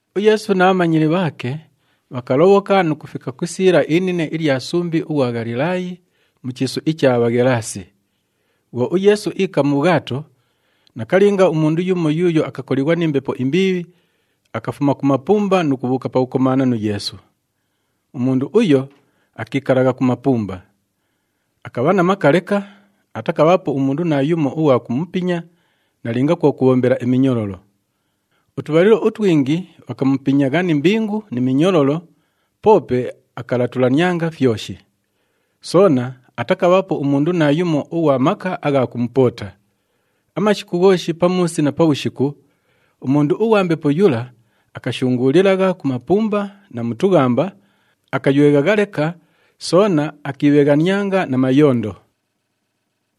UYeesu na bhamanyili bhaake bhakalobhoka nu kufika ku isiila inine ilya sumbi ughwa Ghalilaayi, mu chiisu icha Bhaghelaasi. Bhwo uYeesu iika mu bhwato, nakalinga umundu yumo yuuyo akakolighwa ni mbepo imbiibhi, akafuma ku mapumba nu kubhuuka pakukomaana nu Yeesu. Umundu uyo akiikalagha ku mapumba. Akabha na maka leka, atakabhaapo umundu naayumo ughwa kumupinya nalinga kwo kubhombela iminyololo. Utubhalilo utwingi bhakamupinyagha ni mbingu ni minyololo, poope akalatulanianga fyoshi. Soona atakabhaapo umundu naayumo ughwa maka agha kumupoota. Amashiku ghooshi pamuusi na pabhushiku, umundu ughwa mbepo yula akashunguulilagha ku mapumba na mu tughamba, akayweghagha leka, soona akiibheghanianga na mayondo.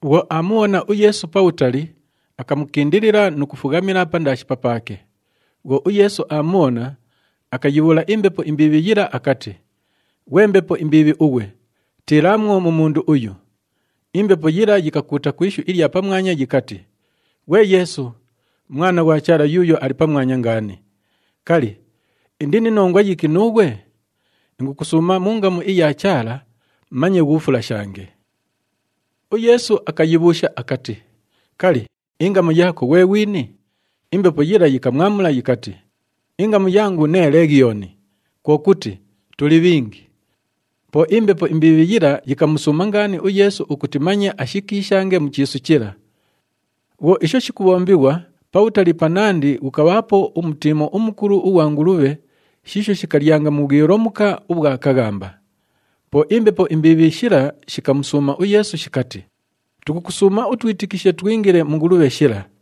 Bhwo aamubhona uYeesu pabhutali, akamukindilila nu kufughamila pandaashi papaake. Bhwo uYeesu aamubhona, akayibhuula imbepo imbiibhi yila akati, “Ghwe mbepo imbiibhi ughwe, tiilaamwo mu mundu uyu!” Imbepo yila yikakuuta ku ishu ilya pamwanya yikati, “Ghwe Yeesu, Mwana ghwa Chaala Yuuyo Ali Pamwanya Ngaani, kali, indi ni nongwa yiki nuughwe? Ingukusuuma mu ngamu iya Chaala, manye ghuufulashange.” UYeesu akayibhuusha akati, “Kali, ingamu yaako ghwe ghwini?” Imbepo yila yikamwamula yikati, “Ingamu yangu nee Leghiyooni, kwo kuti, tuli bhingi.” Po imbepo imbiibhi yila yikamusuuma ngaani uYeesu ukuti manye ashikiishange mu chiisu chila. Bhwo isho shikubhombighwa, pabhutali panandi ghukabhaapo umutiimo umukulu ughwa ngulubhe shiisho shikalyanga mu bhwilomuka ubhwa kaghamba. Po imbepo imbiibhi shila shikamusuuma uYeesu shikati, “Tukukusuuma utwitikishe twingile mu ngulubhe shila.”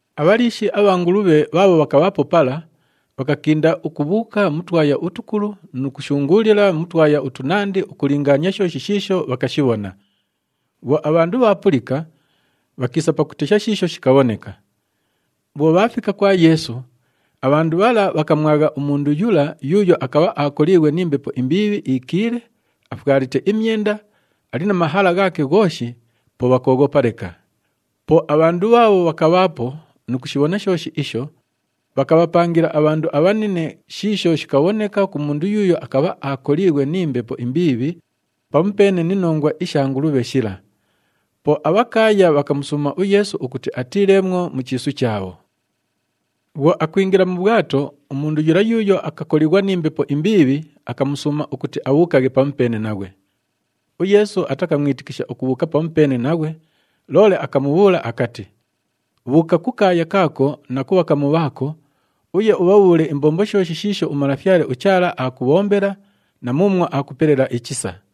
Abhaliishi abha ngulubhe bhaabho bhakabhaapo pala, bhakakinda ukubhuuka mu twaya utukulu nu kushunguulila mu twaya utunandi ukulingaania shooshi shiisho bhakashibhona. Bhwo abhandu bhaapulika, bhakiisa pakutesha shiisho shikabhoneka. Bhwo bhaafika kwa Yeesu, abhandu bhala bhakamwagha umundu yula yuuyo akabha aakoliighwe ni mbepo imbiibhi iikiile, afwalite imyenda, ali na mahala ghaake ghooshi, po bhakooghopa leka. Po abhandu bhaabho bhakabhaapo nu kushibhona shooshi isho, bhakabhapangila abhandu abhanine shiisho shikabhoneka ku mundu yuuyo akabha aakoliighwe ni mbepo imbiibhi pamupeene ni nongwa isha ngulubhe shila. Po abhakaaya bhakamusuuma uYeesu ukuti atiileemwo mu chiisu chaabho. Bhwo akwingila mu bhwato, umundu yula yuuyo akakolighwa ni mbepo imbiibhi akamusuuma ukuti abhuukaghe pamupeene naghwe. UYeesu atakamwitikisha ukubhuuka pamupeene naghwe, loole akamubhuula akati, “Bhuuka ku kaaya kaako na ku bhakamu bhaako, uye ubhabhuule imbombo shooshi shiisho uMalafyale uChaala aakubhombela na muumwo aakupelela ichisa.”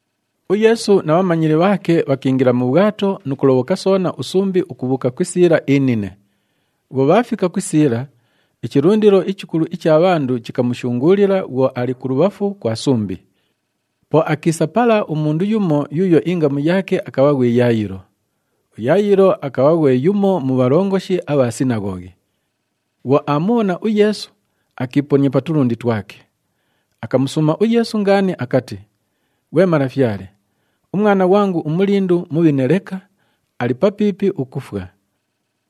UYeesu na bhamanyili bhaake bhakiingila mu bhwato nu kulobhoka soona usumbi ukubhuuka ku isiila inine. Bhwo bhaafika ku isiila, ichilundilo ichikulu icha bhandu chikamushunguulila bhwo ali kulubhafu kwa sumbi. Po akiisa pala umundu yumo yuuyo ingamu yaake akabha ghwi Yayilo. UYayilo akabha ghwe yumo mu bhalongoshi abha sinaghoghi. Bhwo aamubhona uYeesu, akiiponia pa tulundi twake. Akamusuuma uYeesu ngaani akati, “Ghwe Malafyale, umwana ghwangu umulindu mubhine leka, ali papiipi ukufwa.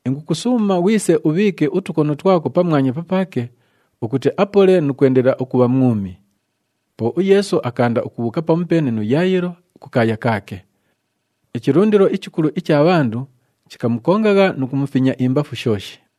Ingukusuuma ghwise ubhiike utukono twako pamwanya papaake ukuti apole nu kwendelela ukubha mwumi.” Po uYeesu akaanda ukubhuuka pamupeene nu Yayilo kukaaya kaake. Ichilundilo ichikulu icha bhandu chikamukongagha nu kumufinya imbafu shooshi.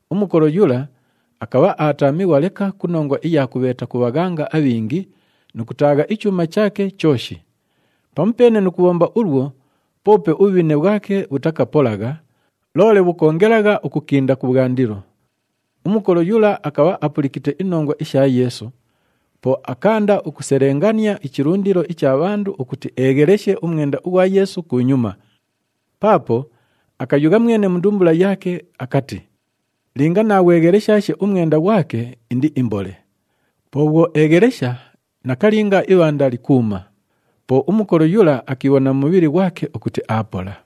Umukolo yula akabha aataamighwa leka ku nongwa iya kubheeta ku bhaghanga abhingi nu kutaagha ichuuma chaake chooshi. Pamupeene nu kubhomba ulwo, poope ubhubhine bhwake bhutakapolagha, loole bhukoongelagha ukukinda kubhwandilo. Umukolo yula akabha apulikite inongwa isha Yeesu, po akaanda ukuselengania ichilundilo icha bhandu ukuti eegheleshe umwenda ughwa Yeesu kunyuma, paapo akayugha mwene mu ndumbula yaake akati, “Linga naaghwegheleshaashe umwenda ghwake indiimbole.” Po bhwo eeghelesha, nakalinga ibhanda likuuma. Po umukolo yula akiibhona mu mubhili ghwake ukuti aapola.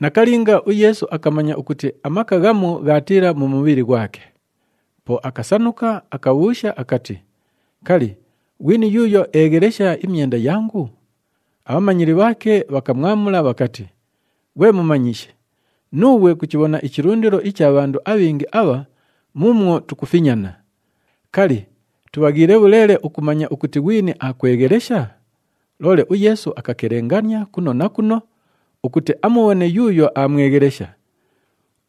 Nakalinga, uYeesu akamanya ukuti amaka ghamu ghaatiila mu mubhili ghwake. Po akasanuka, akabhuusha akati, “Kali, ghwini yuuyo eeghelesha imyenda yangu?” Abhamanyili bhaake bhakamwamula bhakati, “Ghwe Mumanyishi, nuughwe kuchibhona ichilundilo icha bhandu abhingi abha muumwo tukufinyana! Kali, tubhaghiile bhuleele ukumanya ukuti ghwini aakweghelesha?” Loole uYeesu akakelengania kuno na kuno ukuti amubhone yuuyo aamweghelesha.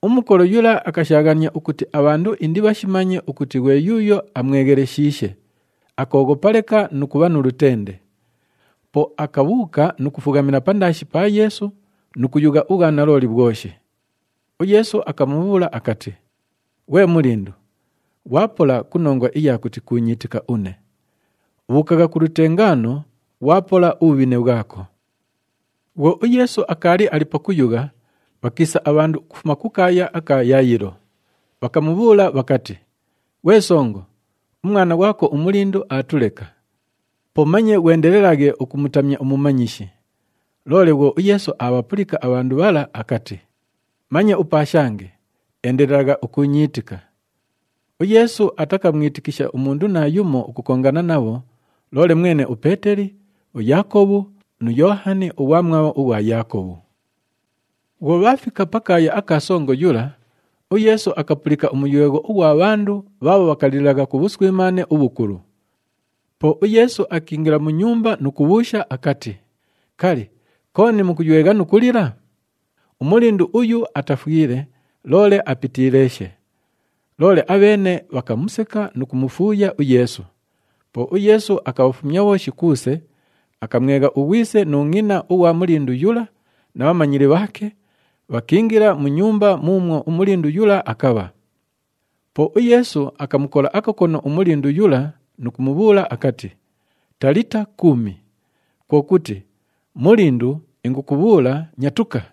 Umukolo yula akashaaghania ukuti abhandu indibhashimanye ukuti ghwe yuuyo amwegheleshiishe, akooghopa leka nu kubha nu lutende. Po akabhuuka nu kufughamila pandaashi pa Yeesu nu kuyugha ubhwanalooli bhwoshi. UYeesu akamubhuula akati, “Ghwe mulindu, ghwapola ku nongwa iya kuti kuunyiitika une. Bhuukagha ku lutengaano, ghwapola ubhubhine bhwako.” Bhwo uYeesu akaali ali pakuyugha, bhakiisa abhandu ukufuma kukaaya aka Yayilo, bhakamubhuula bhakati, “Ghwe songo, umwana ghwako umulindu aatuleka. Po manye ghwendelelaghe ukumutamya umumanyishi.” Loole bhwo uYeesu aabhapulika abhandu bhala akati, “Manye upaashange, endelelagha ukuunyiitika.” UYeesu atakamwitikisha umundu naayumo ukukongana nabho, loole mwene uPeeteli, uYaakobhu nu Yoohani ughwamwabho ughwa Yaakobhu. Bhwo bhaafika pakaaya aka songo yula, uYeesu akapulika umuywegho ughwa bhandu bhaabho bhakalilagha ku bhuswimaane ubhukulu. Po uYeesu akiingila mu nyumba nu kubhuusha akati, “Kali, kooni mukuywegha nu kulila? Umulindu uyu atafwile, loole apitiileeshe.” Loole abheene bhakamuseka nu kumufuuya uYeesu. Po uYeesu akabhafumya bhooshi kuuse, akamwegha ughwise nu ngʼina ughwa mulindu yula na bhamanyili bhaake, bhakiingila mu nyumba muumwo umulindu yula akabha. Po uYeesu akamukola akakono umulindu yula nu kumubhuula akati, “Talita kumi,” kwo kuti, “Mulindu, ingukubhuula, nyatuka.”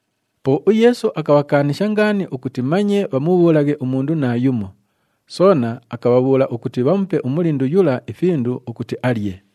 Po uYeesu akabhakaanisha ngaani ukuti manye bhamubhuulaghe umundu naayumo, soona akabhabhuula ukuti bhamupe umulindu yula ifindu ukuti alye.